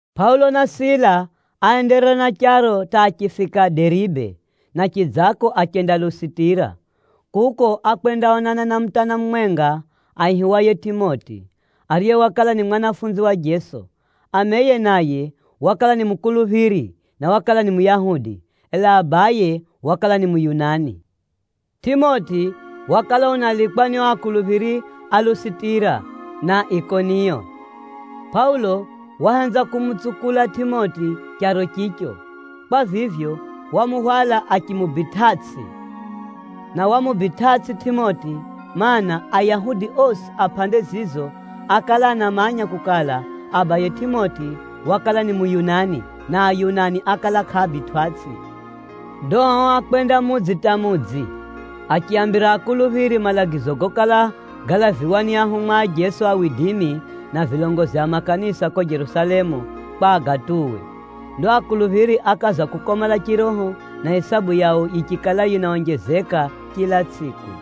Pʼaulo na Sila áenderera na charo hata achifika Deribe, na chidzako achenda Lusitira. Kuko, ákwendaonana na mutana mumwenga aihiwaye Tʼimoti, ariye wakala ni mwanafunzi wa Jeso. Ameye naye wakala ni mukuluphiri, na wakala ni Muyahudi, ela abaye wakala ni Muyunani. Tʼimoti wakala unalikwa ni o akuluphiri a Lusitira, na Ikoniyo. Pʼaulo wahenza kumutsukula Tʼimoti charo chicho. Kwa vivyo, wamuhwala achimubitʼatsʼi, na wamubitʼatsʼi Tʼimoti, mana, Ayahudi osi a pʼande zizo ákala anamanya kukala, abaye Tʼimoti wakala ni Muyunani, na Ayunani ákala kʼaabitwʼatsʼi. Ndo ao ákwenda mudzi hata mudzi, achiaambira akuluphiri malagizo gokala galaviwa ni ahumwa a Jeso na vilongozi a makanisa ko Jerusalemu, kwa agatuwe. Ndo akuluphiri ákaza kukomala chiroho, na isabu yao yichikala yinaonjezeka chila tsʼiku.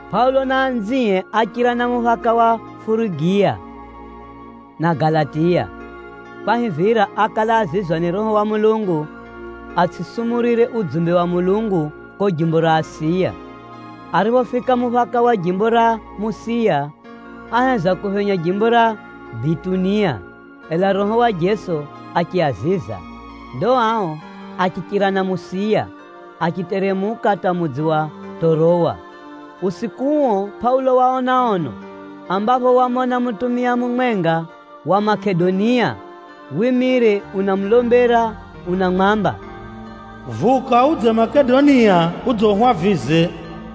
Pʼaulo na anzie áchira na muphaka wa Furugiya na Galatiya, kwahivira ákala azizwa ni Roho wa Mulungu, atsʼisumurire udzumbe wa Mulungu ko jimbo ra Asiya. Ariphofika muphaka wa jimbo ra Musiya, áheza kuphenya jimbo ra Bitunia, ela Roho wa Jeso achiaziza. Ndo ao achichira na Musiya, achiteremuka hata mudzi wa Tʼorowa. Usiku uo, Pʼaulo waona ono, ambapho wamona mutumia mumwenga wa Makedonia wimire unamulombera unamwamba, “Vuka udze Makedonia udze uhwavize.”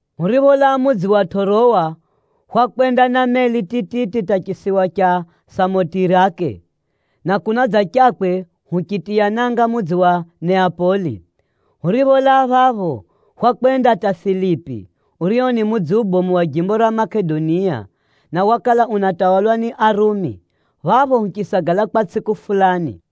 Huripholaa mudzi wa Tʼorowa, hwakwenda na meli tititi hata chisiwa cha Samotirake, na kunadzachakwe huchitiya nanga mudzi wa Neapoli. Huripholaa phapho, hwakwenda hata Filipi, urio ni mudzi ubomu wa jimbo ra Makedonia, na wakala unatawalwa ni Arumi. Phapho huchisagala kwa tsʼiku fulani.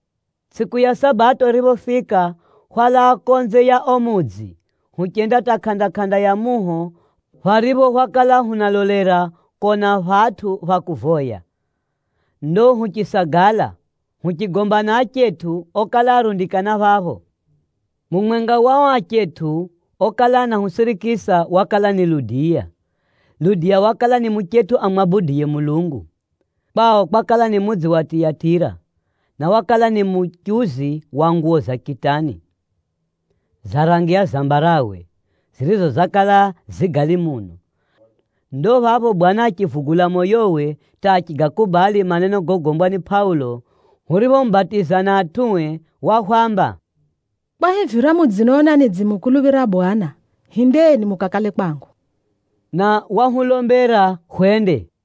Tsʼiku ya Sabato yiriphofika, hwalaa konze ya o mudzi, huchenda hata kʼanda-kʼanda ya muho, pharipho hwakala hunalolera kona phatʼu pha kuvoya. Ndo huchisagala, huchigomba na achetʼu okala arundikana phapho. Mumwenga wa o achetʼu okala anahusirikisa, wakala ni Ludiya. Ludiya wakala ni muchetʼu amwabuduye Mulungu. Kwao kwakala ni mudzi wa Tiyatira, na wakala ni muchuzi wa nguwo za kitani, za rangi ya zambarawe, zirizo zakala zi gali muno. Ndo phapho Bwana achivugula moyowe hata achigakubali maneno gogombwa ni Pʼaulo. Huriphomubatiza na atʼue, wahwamba, “Kwahivira mudzinona nidzimukuluphira Bwana, hindeni mukakale kwangu.” Na wahulombera hwende.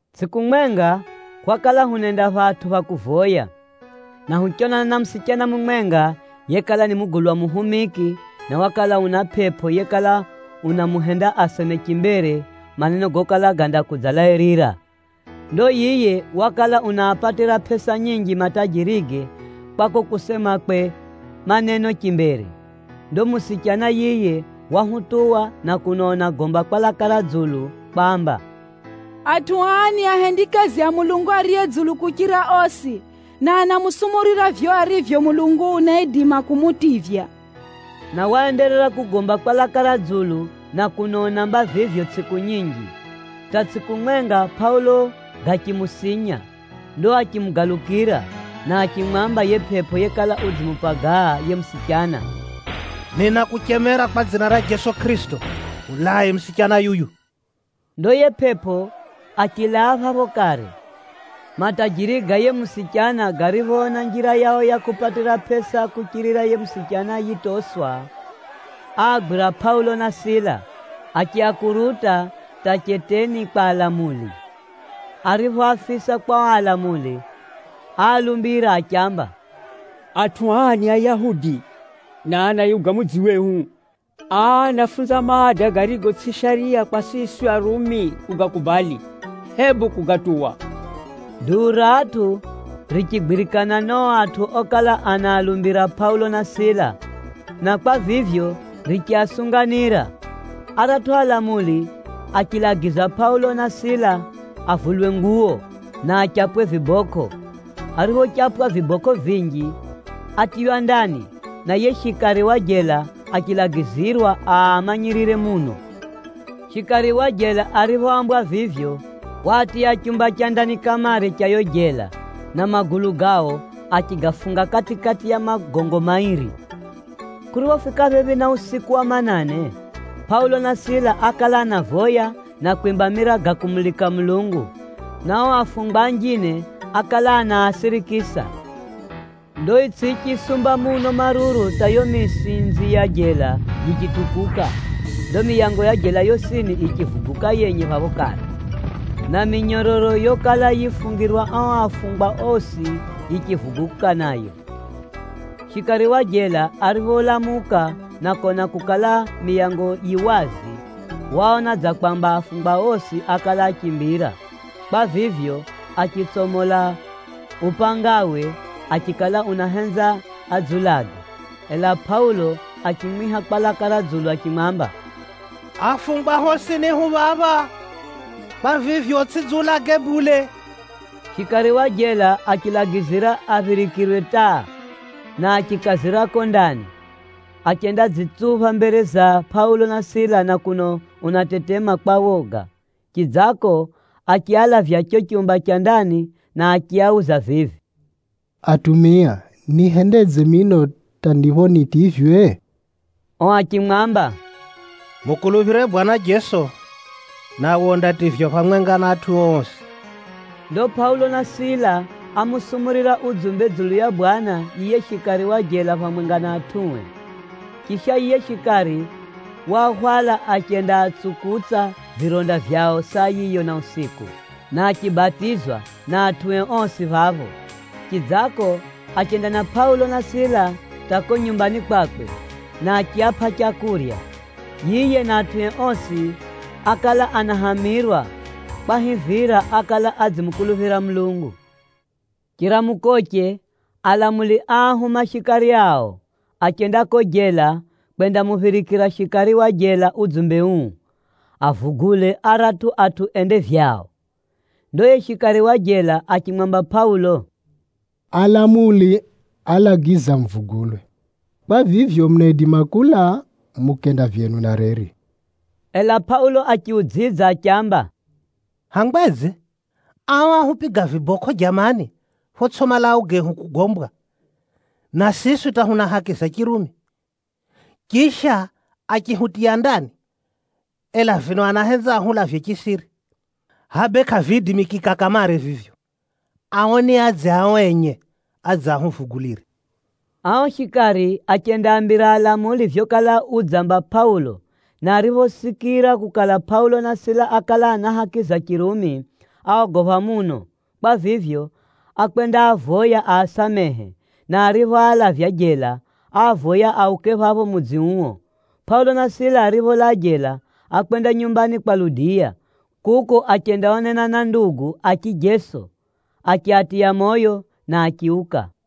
Tsʼiku mwenga, hwakala hunenda phatʼu pha kuvoya, na huchonana na musichana mumwenga yekala ni mugulwa muhumiki, na wakala una pʼepʼo yekala unamuhenda aseme chimbere maneno gokala gandakudzalairira. Ndo yiye wakala unaapatira pʼesa nyinji matajirige kwa ko kusemakwe maneno chimbere. Ndo musichana yiye wahutuwa na kuno unagomba kwa laka ra dzulu kwamba, “Atʼu aa ni ahendikazi a Mulungu Ariye Dzulu kuchira osi, na anamusumurira vivyo arivyo Mulungu unaidima kumutivya.” Na waenderera kugomba kwa laka ra dzulu na kuno unaamba vivyo tsʼiku nyinji, hata tsʼiku mwenga Pʼaulo gachimusinya. Ndo achimugalukira, na achimwamba yiye pʼepʼo yekala udzimupagaa yiye musichana, “Ninakuchemera kwa dzina ra Jeso Kʼirisito, mulae musichana yuyu.” Ndo yiye pʼepʼo achilaa phapho kare. Matajiri ga yiye musichana gariphoona njira yao ya kupatira pʼesa kuchirira yiye musichana yitoswa, áagwira Pʼaulo na Sila, achiakuruta hata cheteni kwa alamuli. Ariphoafisa kwa o alamuli, áalumbira achiamba, “Atʼu aa ni Ayahudi, na anayuga mudzi wehu. Aa anafunza maada garigo tsʼi shariya kwa siswi Arumi kugakubali, hebu kugatuwa.” Duu ra atʼu richigwirikana na o atʼu okala anaalumbira Pʼaulo na Sila, na kwa vivyo, richiasunganira. Aratʼu alamuli achilagiza Pʼaulo na Sila avulwe nguwo, na achapwe vibokʼo. Ariphochapwa vibokʼo vinji, átiywa ndani, na yiye shikari wa jela achilagizirwa aamanyirire muno. Shikari wa jela ariphoambwa vivyo, waatiya chumba cha ndani kamare cha yo jela, na magulu gao achigafunga kati-kati ya magogo mairi. Kuriphofika phephi na usiku wa manane, Pʼaulo na Sila ákala anavoya na kwimba mira ga kumulika Mulungu, na o afungwa anjine ákala anaasirikisa. Ndo itsʼi yichisumba muno maruru hata yo misinzi ya jela yichitukuka. Ndo miyango ya jela yosini yichivuguka yenye phapho kare, na minyororo yokala yifungirwa ao afungwa osi yichivuguka nayo. Shikari wa jela aripholamuka na kona kukala, miyango yi wazi, waona dza kwamba afungwa osi ákala áchimbira. Kwa vivyo, achitsomola upangawe achikala unahenza adziulage. Ela Pʼaulo achimwiha kwa laka ra dzulu achimwamba, “Afungwa hosini hu phapha. Kwa vivyo, utsʼidziulage bule!” Shikari wa jela achilagizira aphirikirwe taa, na achikazira ko ndani, achendadzitsupha mbere za Pʼaulo na Sila na kuno unatetema kwa woga. Chidzako, achialavya cho chumba cha ndani, na achiauza vivi, “Atumia, nihendedze mino hata ndipho nitivywe?” O achimwamba, “Mukuluphire Bwana Jeso, nawe undativywa phamwenga na atʼuo osi.” Ndo Pʼaulo na Sila ámusumurira udzumbe dzulu ya Bwana yiye shikari wa jela phamwenga na atʼue. Chisha, yiye shikari waahwala achendaatsukutsa vironda vyao saa yiyo na usiku, na achibatizwa na atʼue osi phapho. Chidzako, achenda na Pʼaulo na Sila hata ko nyumbani kwakwe, na achiapʼa leu. Yiye na atʼue osi ákala anahamirwa, kwahivira ákala adzimukuluphira Mulungu. Chiramukoche, alamuli áahuma shikari ao, achenda ko jela kwendamuphirikira shikari wa jela udzumbe uu, “Avugule aratʼu atʼu ende vyao.” Ndo yiye shikari wa jela achimwamba Pʼaulo, “Alamuli alagiza muvugulwe. Kwa vivyo, munaidima kulaa mukenda vyenu na reri.” Ela Pʼaulo achiudzidza achiamba, “Hangwedze? Ao áhupiga vibokʼo jamani photsʼi malau gehu kugombwa, na siswi hata huna haki za Chirumi! Chisha, achihutiya ndani, ela vino anahenza ahulavye chisiri! Hʼa bee kʼaviidimikika kamare vivyo! Ao niadze ao enye, adze ahuvugulire.” Ao shikari achendaambira alamuli vyokala udzamba Pʼaulo, na ariphosikira kukala Pʼaulo na Sila ákala ana haki za Chirumi, áogopha muno. Kwa vivyo, ákwendaavoya aasamehe, na ariphoalavya jela, áavoya auke phapho mudzi uo. Pʼaulo na Sila aripholaa jela, ákwenda nyumbani kwa Ludiya. Kuko achendaonana na ndugu a chijeso, achiatiya moyo na achiuka.